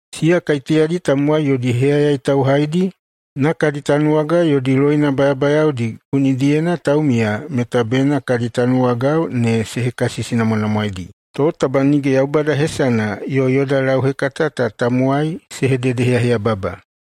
Siya kaiteyadi tamowai yodi heyayai tauhaidi na kadi tanuwagao yodi loina bayabayaodi gunidiyena taumiya meta bena kadi tanuwagao ne se hekasisinamwanamwaeidi. To taba nige Yaubada hesana yo yoda lauhekata ta tamowai se hededeheyaheyababa.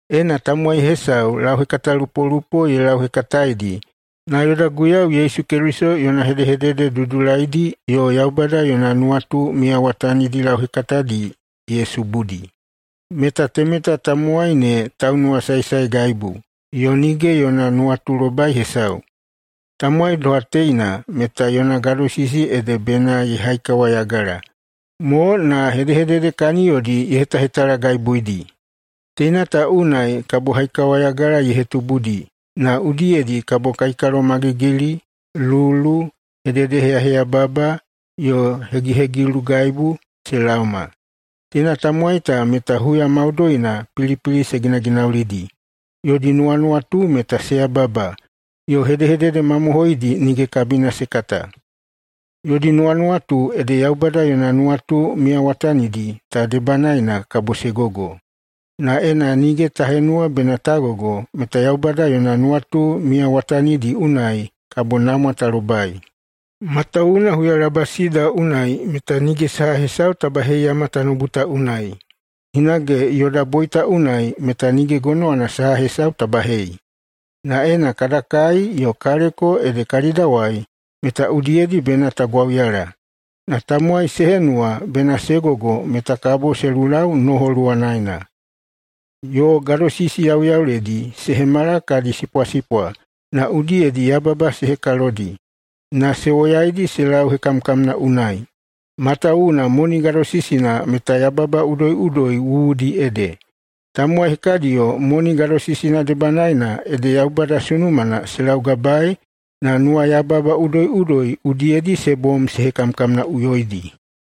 Ena tamowai hesau lauhekatalupolupo ye lauhekataedi, na yoda Guiyau Yesu Keliso yona hedehedede dudulaidi yo Yaubada yona nuwatu miyawatanidi lauhekatadi ye subudi, meta temeta tamowai ne taunuwasaesaegaibu yo nige yona nuwatulobai hesau. Tamowai doha teina meta yona gadosisi ede bena ye haikawayagala mo na hedehedede kaniyodi ye hetahetalagaibuidi. Teina ta unai kabo haikawayagala ye hetubudi na udiyedi kabo kaikalomagigili, lulu, hedehededeheyaheyababa, yo hegihegilugaibu se laoma. Teina tamowai ta meta huya maudoina pilipili se ginaginaulidi, yodi nuwanuwatu meta se yababa yo hedehedede mamohoidi nige kabina se kata. Yodi nuwanuwatu ede Yaubada yona nuwatu miyawatanidi ta debanaena kabo se gogo. Na ena nige ta henuwa bena ta gogo, meta Yaubada yona nuwatu miyawatanidi unai kabo namwa ta lobai. Matawuwuna huyalabasida unai meta nige saha hesau ta baheiyama tanoubu ta unai, hinage yoda boita unai meta nige gonowana saha hesau ta bahei. Na ena kada kai yo kaleko ede kalidawai, meta udiyedi bena ta gwauyala. Na tamowai se henuwa bena se gogo meta kabo se lulau noho luwanaena, yo gadosisi yauyauledi se hemala kadi sipwasipwa na udiyedi yababa se hekalodi, na se woyaidi se lau hekamkamna unai. Matawuwuna moni gadosisina meta yababa udoiꞌudoi wuwudi ede. Tamowai hekadiyo moni gadosisina debanaena ede Yaubada sunumana se laugabaei na nuwayababa udoiꞌudoi udiyedi se bom se hekamkamnaꞌuyoidi.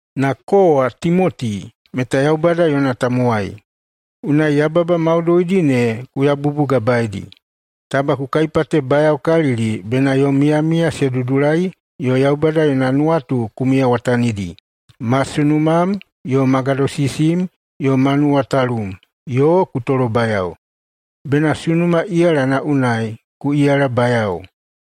Na kowa, Timoti, meta Yaubada yona tamowai. Unai yababa maudoidi ne ku yabubugabaedi. Taba ku kaipatebayaokalili bena yom miyamiya se dudulai yo Yaubada yona nuwatu ku miyawatanidi, ma sunumam yo ma gadosisim yo ma nuwatalum, yo ku tolobayao. Bena sunuma iyalana unai ku iyalabayao.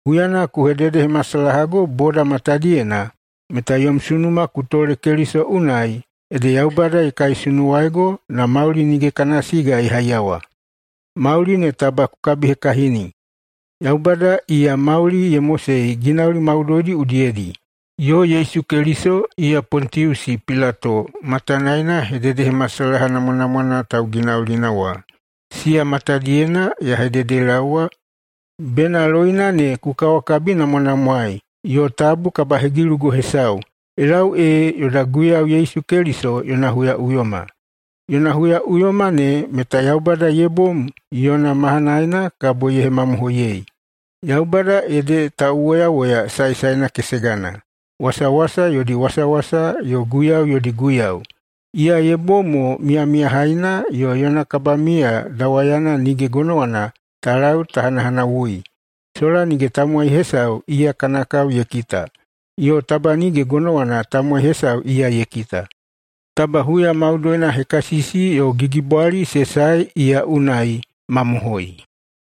Huyana ku hededehemasalahago boda matadiyena meta yom sunuma ku tole Keliso unai, ede Yaubada ye kaisunuwaigo na mauli nige kana siga ye haiyawa. Mauli ne taba ku kabihekahini! Yaubada, iya mauli ye mosei ginauli maudoidi udiyedi, yo Yesu Keliso, iya Pontiusi Pilato matanaena hededehemasalaha namwanamwana tauginaulina wa, siya matadiyena ya hededelaowa bena loina ne ku kawakabinamwanamwaei yo tabu kabahegilugo hesau, ye lau ee yoda Guiyau Yesu Keliso yona huyaꞌuyoma. Yona huyaꞌuyoma ne meta Yaubada ye bom yona mahanaena kabo ye hemamohoiyei. Yaubada ede tauwoyawoya saesaena kesegana, wasawasa yodi wasawasa yo guiyau yodi Guiyau, iya ye bom mo miyamiyahaina yo yona kabamiya dawayana nige gonowana ta lau ta hanahanawui, sola nige tamowai hesau iya kana kao ye kita, yo taba nige gonowana tamowai hesau iya ye kita. Taba huya maudoina hekasisi yo gigibwali se sae iya unai. Mamohoi.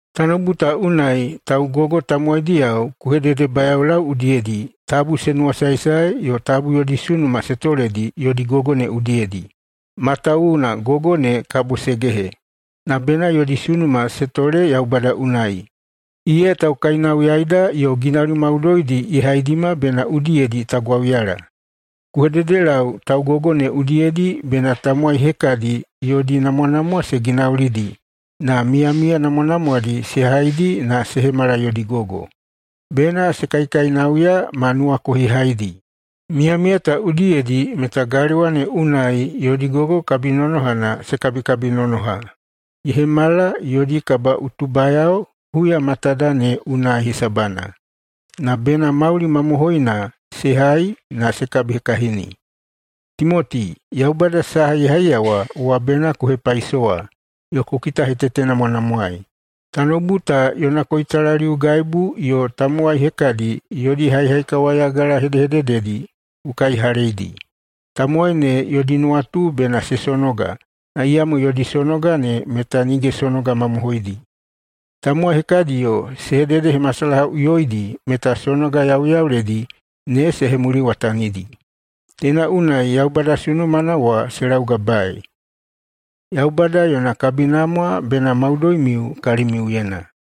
Tanoubu ta unai taugogo tamowaidiyao ku hededebayaolau udiyedi tabu se nuwasaesae yo tabu yodi sunuma se toledi yodi gogo ne udiyedi, matawuwuna gogo ne kabo se gehe. Na bena yodi sunuma se tole Yaubada unai, iya taukainauyaida yo ginauli maudoidi ye haidima bena udiyedi ta gwauyala. Ku hededelau taugogo ne udiyedi bena tamowai hekadi yodi namwanamwa se ginaulidi, na miyamiya namwanamwadi se haidi na se hemala yodi gogo. Bena se kaikainauya ma nuwakohihaidi. Miyamiya ta udiyedi meta galewa ne unai yodi gogo kabinonohana se kabikabinonoha, ye hemala yodi kabaꞌutubayao huya matada ne unai hesabana, na bena mauli mamohoina se hai na se kabihekahini. Timoti, Yaubada saha ye haiyawa wa bena ku hepaisowa yo ku kitahetetenamwanamwaei. Tanoubu ta yona koitalaliugaibu yo tamowai hekadi yodi haihaikawayagala hedehedededi ku kaihaleidi. Tamowai ne yodi nuwatu bena se sonoga, na iyamo yodi sonoga ne meta nige sonoga mamohoidi. Tamowai hekadiyo se hededehemasalahaꞌuyoidi meta sonoga yauyauledi ne se hemuliwatanidi. Teina unai Yaubada sunumana wa se laugabaei. Yaubada yona kabinamwa bena maudoimiu kalimiuyena.